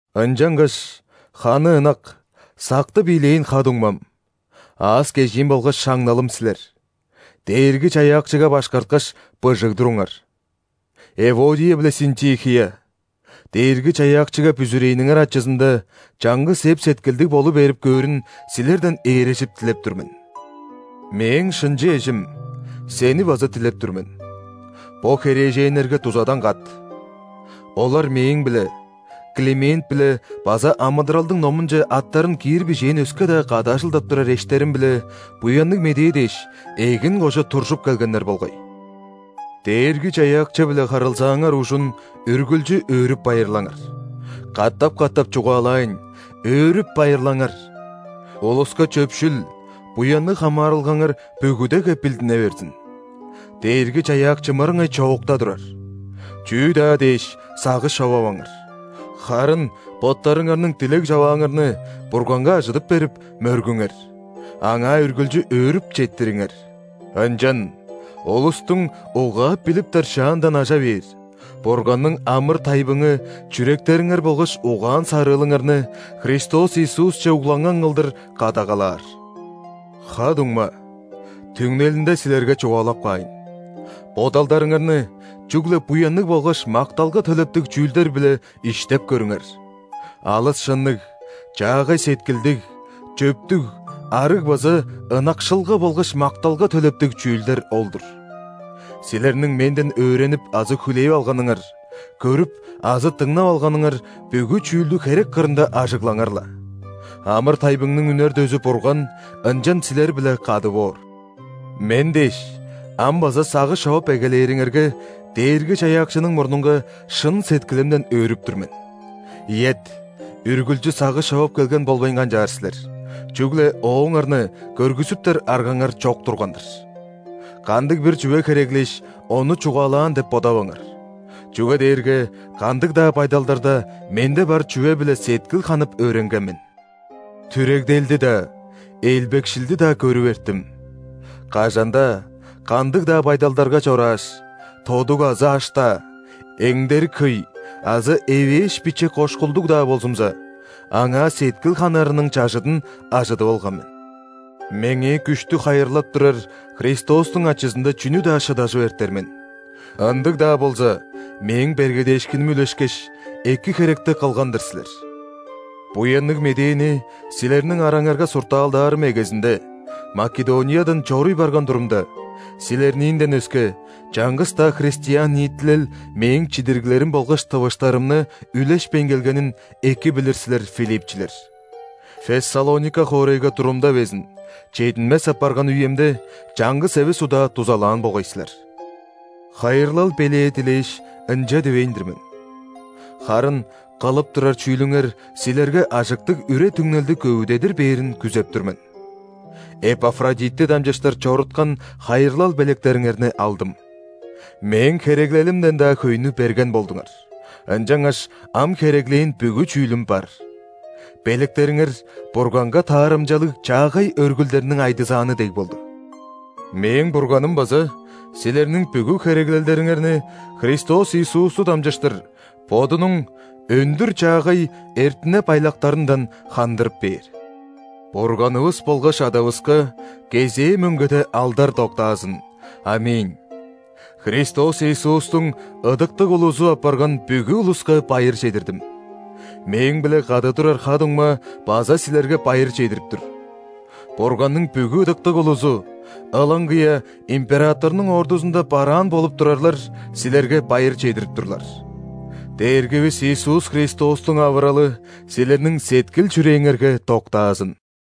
Ынчангаш, ханы ынак, сактып ийлээн ха-дуңмам, аас-кежиим болгаш шаңналым силер: Дээрги-Чаяакчыга башкарткаш, быжыг туруңар. Эводия биле Синтихия, Дээрги-Чаяакчыга бүзүрээниңер ачызында чаңгыс эп-сеткилдиг болу берип көөрүн силерден ээрежип дилеп тур мен. Мээң шынчы эжим, сени база дилеп тур мен: бо херээженнерге дузадан кат. Олар мээң-биле, Климент-биле база амыдыралдың номунче аттарын киир бижээн өске-даа кады ажылдап турар эштерим-биле Буянныг Медээ дээш, эгин кожа туржуп келгеннер болгай. Дээрги-Чаяакчы-биле харылзааңар ужун үргүлчү өөрүп-байырлаңар. Катап-катап чугаалаайн: өөрүп-байырлаңар! Улуска чөпшүл, буянныг хамаарылгаңар бүгүдеге билдине берзин. Дээрги-Чаяакчы мырыңай чоокта турар. Чүү-даа дээш, сагыш човаваңар, харын боттарыңарның дилег-човааңарны Бурганга ажыдып берип, мөргүңер, Аңаа үргүлчү өөрүп четтириңер. Ынчан улустуң угаап-билиптер шаандан ажа бээр Бурганның амыр-тайбыңы чүректериңер болгаш угаан-сарыылыңарны Христос Иисусче угланган кылдыр кадагалаар. Ха-дуңма, түңнелинде силерге чугаалап каайн, бодалдарыңарны чүгле буянныг болгаш макталга төлептиг чүүлдер-биле иштеп көрүңер: алыс шынныг, чаагай сеткилдиг, чөптүг, арыг база ынакшылга болгаш макталга төлептиг чүүлдер ол-дур. Силерниң менден өөренип азы хүлээп алганыңар, көрүп азы дыңнап алганыңар бүгү чүүлдү херек кырында ажыглаңар-ла. Амыр-тайбыңның үнер дөзү Бурган ынчан силер-биле кады боор. Мен дээш, ам база сагыш човап эгелээриңерге, Дээрги-Чаяакчының мурнунга шын сеткилимден өөрүп тур мен. Ийет, үргүлчү сагыш човап келген болбайн канчаар силер, чүгле ооңарны көргүзүптер аргаңар чок турган-дыр. Кандыг-бир чүве хереглээш, ону чугаалаан деп бодаваңар, чүге дээрге кандыг-даа байдалдарда менде бар чүве-биле сеткил ханып өөренген мен. Түрегделди-даа, элбекшилди-даа көрүп эрттим, кажан-даа, кандыг-даа байдалдарга чорааш, тодуг азы аш-даа, эңдерик хөй азы эвээш-биче кошкулдуг-даа болзумза, аңаа сеткил ханарының чажыдын ажыдып алган мен. Меңээ күштү хайырлап турар Христостуң ачызында чүнү-даа шыдажып эртер мен. Ындыг-даа болза, мээң бергедээшкиним үлешкеш, эки херекти кылган-дыр силер. Буянныг Медээни силерниң араңарга суртаалдаарым эгезинде, Македониядан чоруй барган турумда, силерниинден өске, чаңгыс-даа христиан ниитилел мээң чидириглерим болгаш тывыштарымны үлешпейн келгенин эки билир силер, филипчилер. Фессалоника хоорайга турумда безин, чединмес апарган үемде, чаңгыс эвес удаа дузалаан болгай силер. Хайырлал белээ дилээш, ынча дивейн-дир мен. Харын кылып турар чүүлүңер силерге ажыктыг үре-түңнелди көвүдедир бээрин күзеп тур мен. Эпафродитти дамчыштыр чоруткан хайырлал белектериңерни алдым. Мээң хереглелимден-даа хөйнү берген болдуңар, ынчангаш ам хереглээн бүгү чүүлүм бар. Белектериңер – Бурганга таарымчалыг чаагай өргүлдерниң айдызааны дег болду. Мээң Бурганым база силерниң бүгү хереглелдериңерни Христос Иисусту дамчыштыр Бодунуң өндүр-чаагай эртине-байлактарындан хандырып бээр! Бурганывыс болгаш Адавыска кезээ мөңгеде алдар доктаазын. ·Аминь. Христос Иисустуң ыдыктыг улузу апарган бүгү улуска байыр чедирдим. Мээң-биле кады турар ха-дуңма база силерге байыр чедирип тур. Бурганның бүгү ыдыктыг улузу, ылаңгыя императорнуң ордузунда бараан болуп турарлар, силерге байыр чедирип турлар. Дээргивис Иисус Христостуң авыралы силерниң сеткил-чүрээңерге доктаазын!